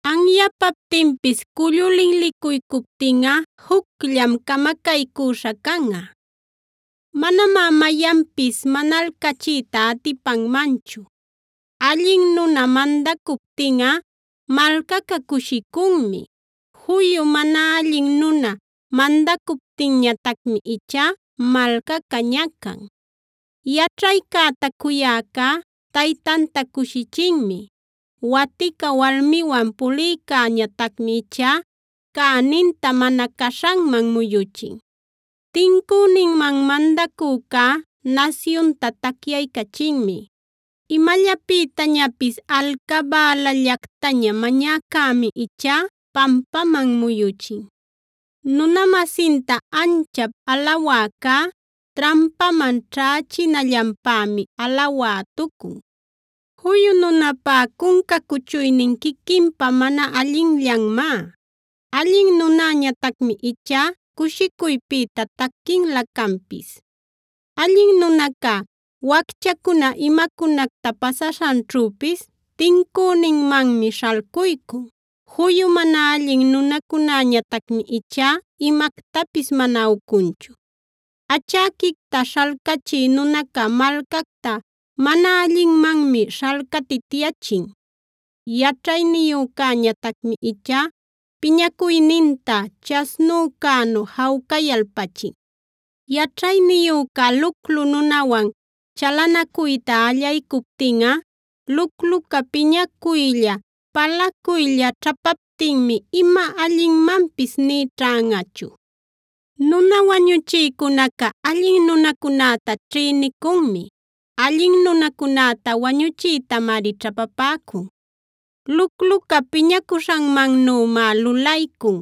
Anyapaptinpis cullu linlicuycuptinꞌa jucllam camacaycüśha canꞌa; manamá mayanpis manalcachiyta atipanmanchu. Allin nuna mandacuptinꞌa malcaca cushicunmi; juyu mana allin nuna mandacuptinñatacmi ichá malcaca ñacan. Yaćhaycäta cuyäcá taytanta cushichinmi; watica walmiwan pulïcäñatacmi ichá cäninta mana caśhanman muyuchin. Tincüninman mandacücá nasyunta tacyaycachinmi; imallapïtañapis alcabälallactaña mañäcämi ichá pampaman muyuchin. Nuna-masinta anchap alawäcá, trampaman ćhächinallanpämi alawätucun. Juyu nunäpá cunca cuchuynin quiquinpa mana allinllanmá; allin nunäñatacmi ichá cushicuypïta taquinlä canpis. Allin nunacá, wacchacuna imacunacta pasaśhanćhüpis tincüninmanmi śhalcuycun; juyu mana allin nunacunätañatacmi ichá imactapis mana ucunchu. Achäquicta śhalcachï nunaca malcacta mana allinmanmi śhalcatityachin; yaćhayniyücäñatacmi ichá piñacuyninta chasnücänu jawcayalpachin. Yaćhayniyüca luclu nunawan chalanacuyta allaycuptinꞌa, lucluca piñacuylla, palacuylla ćhapaptinmi ima allinmanpis nï ćhanꞌachu. Nuna wañuchïcunaca allin nunacunäta ćhïnicunmi; allin nunacunäta wañuchiytamari ćhapapäcun. Lucluca piñacuśhanmannümá lulaycun;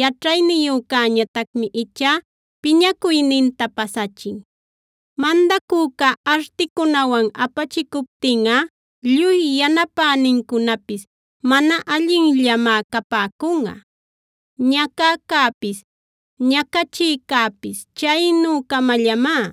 yaćhayniyücäñatacmi ichá piñacuyninta pasachin. Mandacüca articunawan apachicuptinꞌa, lluy yanapänincunapis mana allinllamá capäcunꞌa. Ñacäcäpis, ñacachïcäpis chaynü-camallamá;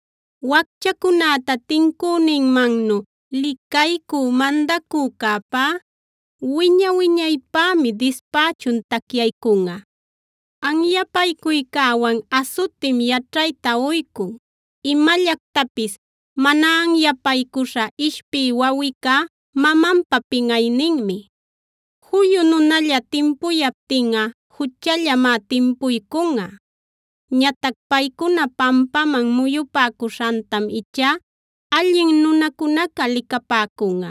Wacchacunäta tincüninmannu licaycü mandacücäpá wiña-wiñaypämi dispächun tacyaycunꞌa. Anyapaycuycäwan asutim yaćhayta uycun; imallactapis mana anyapaycuśha ishpï wawicá mamanpa pinꞌayninmi. Juyu nunalla timpuyaptinꞌa juchallamá timpuycunꞌa; ñatac paycuna pampaman muyupäcuśhantam ichá allin nunacunaca licapäcunꞌa.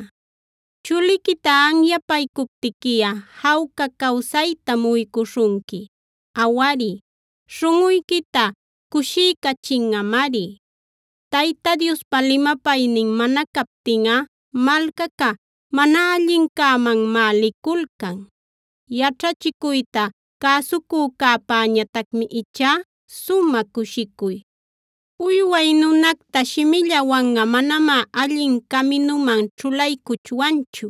Chuliquita anyapaycuptiquiꞌa jawca cawsaytam uycuśhunqui; awari, śhunꞌuyquita cushiycachinꞌamari. Tayta Diospa limapaynin mana captinꞌa malcaca mana allincämanmá liculcan; yaćhachicuyta cäsucücäpäñatacmi ichá sumä cushicuy. Uyway nunacta shimillawanꞌa manamá allin caminuman ćhulaycuchwanchu;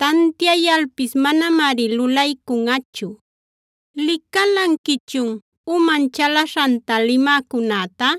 tantiayalpis manamari lulaycunꞌachu. ¿Licalanquichun uman chalaśhanta limäcunäta?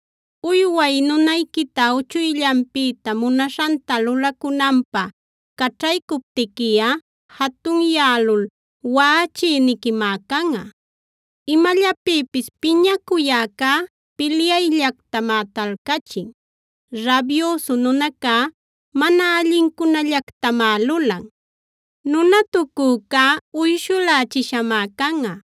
Uyway nunayquita uchuyllanpïta munaśhanta lulacunanpä caćhaycuptiquiꞌa, jatunyälul waꞌachïniquimá canꞌa. Imallapïpis piñacuyäcá pilyayllactamá talcachin; rabyüsu nunacá mana allincunallactamá lulan. Nunatucücá uyshulächishamá canꞌa;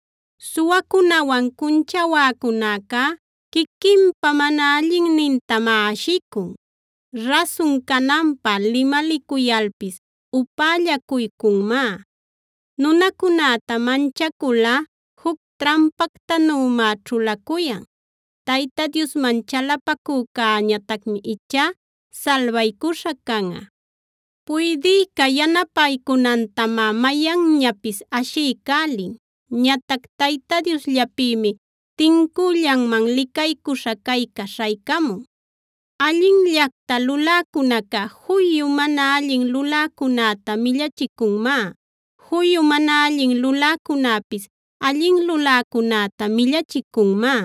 Suwacunawan cunchawänacücá quiquinpa mana allinnintamá ashicun; rasun cananpä limalicuyalpis upällacuycunmá. Nunacunäta manchaculꞌa juc trampactanümá ćhulacuyan; Tayta Diosman chalapacücäñatacmi ichá salbaycuśha canꞌa. Puydïca yanapaycunantamá mayanñapis ashiycälin; ñatac Tayta Diosllapïmi tincüllanman licaycuśha cayca śhaycamun. Allinllacta luläcunaca juyu mana allin luläcunäta millachicunmá; juyu mana allin luläcunäpis allin luläcunäta millachicunmá.